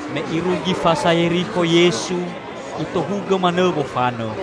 Me irugi fasa Yerikho Yesu, Itohugõ manõ wofanõ.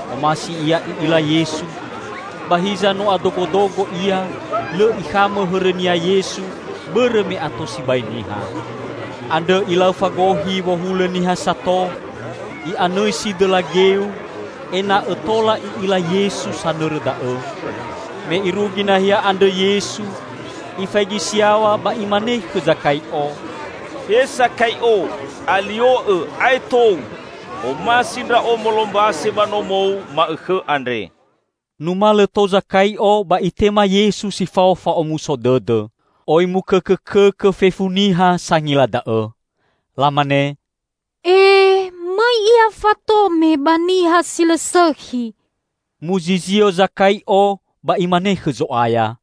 Omasi ia i'ila Yesu. Ba hiza no adogodogo ia, lõ ikhamõ hõrõnia Yesu bõrõ me ato sibai niha. Andrõ ilau fagohi wohulõ niha sato, i'anõisi dõla geu, ena'õ tola i'ila Yesu sanõrõ da'õ. Me irugi nahia andrõ Yesu, Ifaigi si yaw̃a ba Imane khõ Zakai'o, "He Sakai'o, alio'õ ae'e tou! Omasi Ndra'o molombase ba nomou ma'õkhõ andre." Numalõ tou Zakai'o ba itema Yesu si fao fa'omuso dõdõ. Oi mukõkõkõkõ fefu niha sangila da'õ. Lamane, "E, mõi Ia fatome ba niha si lõ sõkhi!" Muzizio Zakai'o ba imane khõ Zo'aya,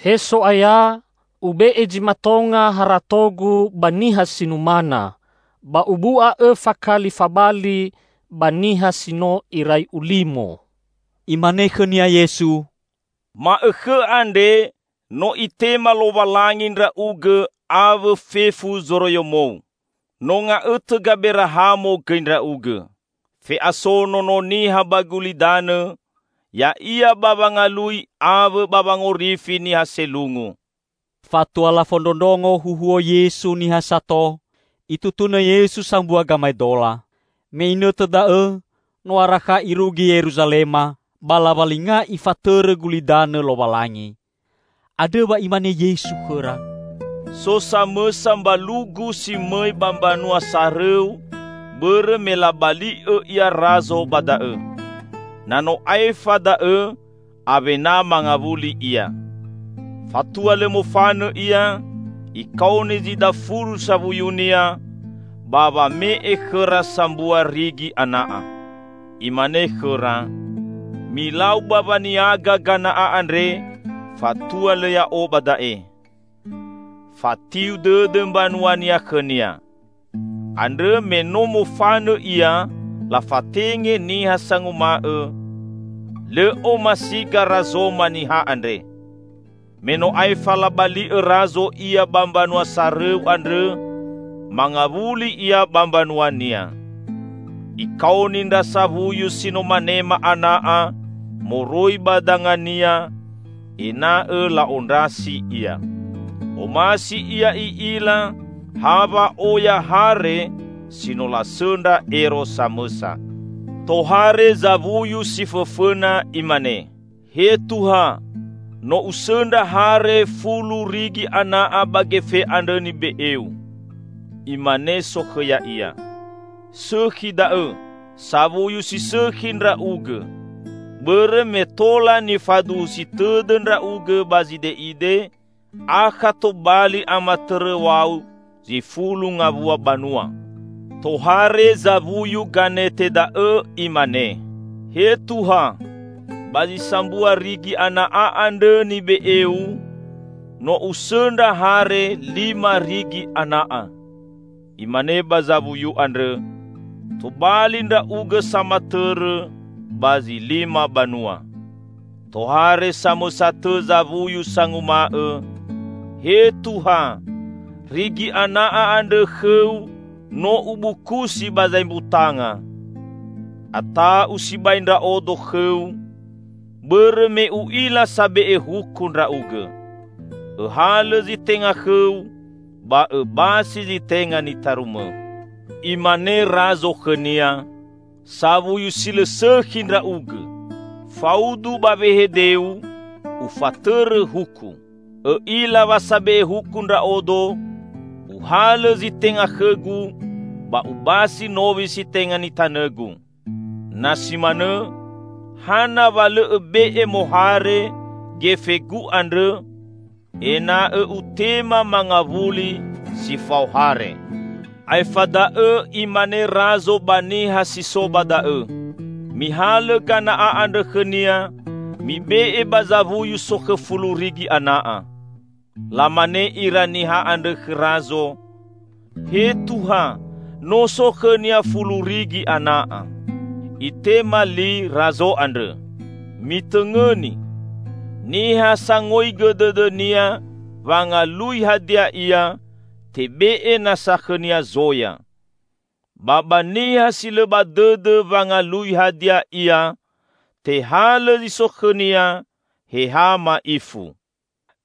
"He So'aya, ube'e zi matonga haratogu ba niha si numana; ba ubu'a õfa kali fabali ba niha si no irai ulimo!" Imane khõnia Yesu, "Ma'õkhõ andre no Itema Lowalangi ndra'ugõ awõ fefu zoroiyomou. No nga'õtõ Gaberahamo gõi ndra'ugõ. Fe'aso Nono Niha ba gulidanõ, ya'ia ba wangalui awõ ba wangorifi niha selungu." Fatua lafondrondrongo huhuo Yesu niha sato, Itutunõ Yesu sambua gamaedola. Me inõtõ da'õ no arakha Irugi Yeruzalema, ba lawalinga Ifatõrõ gulidanõ Lowalangi. Andrõ wa Imane Yesu khõra, "So samõsa mbalugu si mõi ba mbanua sarõu bõrõ me labali'õ ia Razo ba da'õ. Na no aefa da'õ awena mangawuli ia. Fatua lõ mofanõ ia, ikaoni zi dafulu sawuyunia, ba wame'e khõra sambua rigi ana'a. Imane khõra, 'Milau ba waniaga gana'a andre fatua lõ ya'o ba da'e.' Fatiu dõdõ mbanuania khõnia. Andrõ me no mofanõ ia lafatenge niha sanguma'õ, 'Lõ omasiga Razoma niha andre.' Me no aefa labali'õ Razo ia ba mbanua sarõu andrõ, mangawuli ia ba mbanuania. Ikaoni ndra sawuyu si no manema ana'a moroi ba dangania, ena'õ la'ondrasi ia. Omasi ia i'ila ha wa'oya hare si no lasõndra ero samõsa. Tohare zawuyu si fõfõna imane, 'He Tuha, no usõndra hare fulu rigi ana'a ba gefe andrõ nibe'eu.' Imane sokhõ ya'ia, 'Sõkhi da'õ, sawuyu si sõkhi ndra'ugõ! Bõrõ me tola nifaduhusi tõdõ ndra'ugõ ba zide'ide, akha tobali amatõrõw̃au zi fulu ngawua banua.' Tohare zawuyu ganete da'õ imane, 'He Tuha. Ba zi sambua rigi ana'a andrõ nibe'eu, no usõndra hare lima rigi ana'a.' Imane ba zawuyu andrõ, 'Tobali ndra'ugõ samatõrõ ba zi lima banua.' Tohare samõsa tõ zawuyu sanguma'õ, 'He Tuha, rigi ana'a andrõ khõu no ubukusi ba zaembutanga. Ata'u sibai ndra'odo khõu, bõrõ me u'ila sabe'e huku ndra'ugõ. Õhalõ zi tenga khõu ba õbasi zi tenga nitarumõ.' Imane Razo khõnia, 'Sawuyu si lõ sõkhi ndra'ugõ! Faudu ba wehedeu, ufatõrõ huku. Õ'ila wa sabe'e huku ndra'odo: Uhalõ zi tenga khõgu ba ubasi nowi si tenga nitanõgu. Na si manõ hana wa lõ õbe'e mohare gefegu andrõ, ena'õ utema mangawuli si fao hare!' Aefa da'õ imane Razo ba niha si so ba da'õ, 'Mihalõ gana'a andrõ khõnia, mibe'e ba zawuyu sokhõ fulu rigi ana'a.' Lamane ira niha andrõ khõ Razo, 'He Tuha, no so khõnia fulu rigi ana'a.' Itema li Razo andrõ, 'Mitõngõni: Niha sangoigõ dõdõnia wangalui hadia ia, tebe'e nasa khõnia zoya. Ba ba niha si lõ ba dõdõ wangalui hadia ia tehalõ zi so khõnia he ha ma'ifu.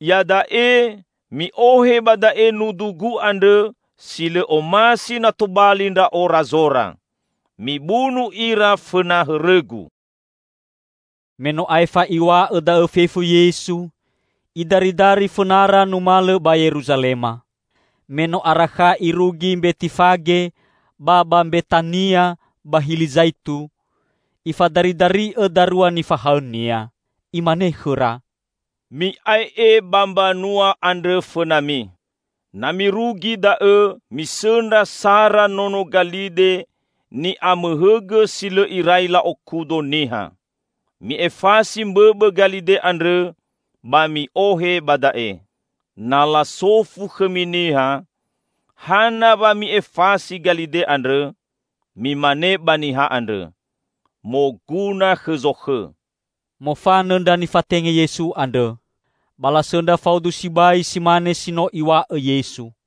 Iada'e mi'ohe ba da'e nudugu andrõ si lõ omasi na tobali ndra'o Razora. Mibunu ira fõna hõrõgu!'" Me no aefa Iw̃a'õ da'õ fefu Yesu, Idaridari fõnara numalõ ba Yeruzalema. Me no arakha Irugi Mbetifage ba ba Mbetania ba Hili Zaitu, Ifadaridari'õ darua nifahaõ-Nia. Imane khõra, "Mi'ae'e ba mbanua andrõ fõnami. Na mirugi da'õ misõndra sara nono galide ni'amohõgõ si lõ irai la'okudo niha. Mi'efasi mbõbõ galide andrõ ba mi'ohe ba da'e. Na lasofu khõmi niha, 'Hana wa mi'efasi galide andrõ?' Mimane ba niha andrõ, 'Moguna khõ Zokhõ.'" Mofanõ ndra nifatenge Yesu andrõ. Ba lasõndra faudu sibai si mane si no Iw̃a'õ Yesu.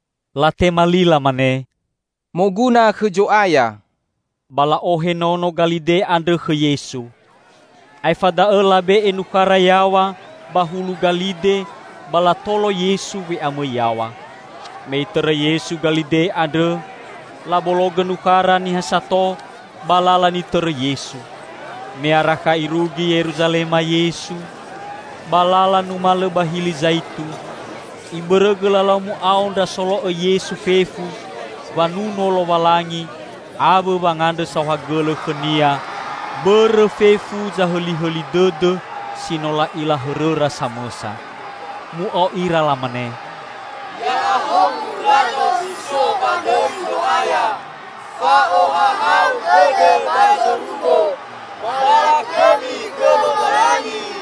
Latema li lamane, "Moguna khõ Zo'aya?" Ba la'ohe nono galide andrõ khõ Yesu. Aefa da'õ labe'e nukhara yaw̃a ba hulu galide ba latolo Yesu we'amõi yaw̃a. Me Itõrõ Yesu galide andrõ, labologõ nukhara niha sato ba lala nitõrõ Yesu. Me arakha irugi Yeruzalema Yesu, ba lala numalõ ba Hili Zaitu, ibõrõgõ lalau mu'ao ndra solo'õ Yesu fefu wanuno Lowalangi awõ wangandrõ saohagõlõ khõ-Nia bõrõ fefu zahõlihõli dõdõ si no la'ila hõrõra samõsa. Mu'ao ira lamane, "Ya'ahowu Razo si so ba dõi Zo'aya! Fa'ohahau dõdõ ba zorugo, ba lakhõmi khõ Lowalangi!"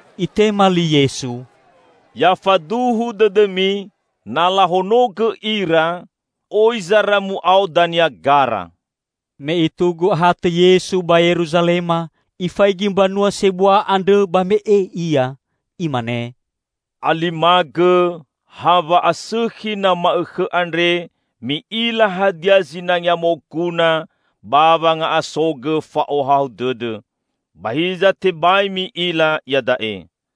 Itema li Yesu, "Ya faduhu dõdõmi, na lahonogõ ira, oi zara mu'ao dania gara." Me itugu ahatõ Yesu ba Yeruzalema, ifaigi mbanua sebua andrõ ba me'e Ia. Imane, "Alimagõ, ha wa'asõkhi na ma'õkhõ andre mi'ila hadia zinangea moguna ba wanga'asogõ fa'ohahau dõdõ! Ba hiza tebai mi'ila iada'e.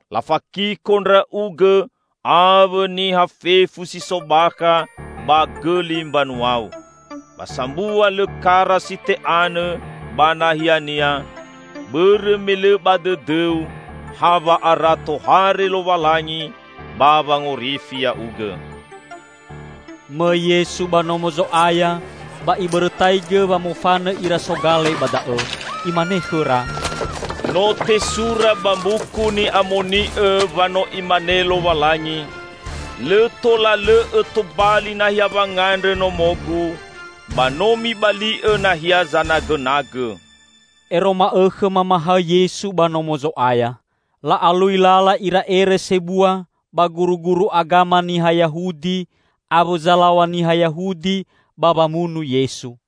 Lafakiko ndra'ugõ awõ niha fefu si so bakha ba gõli mbanuau; ba sambua lõ kara si te'anõ ba nahiania, bõrõ me lõ ba dõdõu ha wa'ara tohare Lowalangi ba wangorifi ya'ugõ!" Mõi Yesu ba Nomo Zo'aya ba Ibõrõtaigõ wamofanõ ira sogale ba da'õ. Imane khõra, "No tesura ba Mbuku Ni'amoni'õ wa no Imane Lowalangi, 'Lõ tola lõ'õ tobali nahia wangandrõ Nomo-Gu.' Ba no mibali'õ nahia zanagõnagõ!" Ero ma'õkhõ mamahaõ Yesu ba Nomo Zo'aya. La'alui lala ira ere sebua ba guruguru agama niha Yahudi awõ zalaw̃a niha Yahudi ba wamunu Yesu.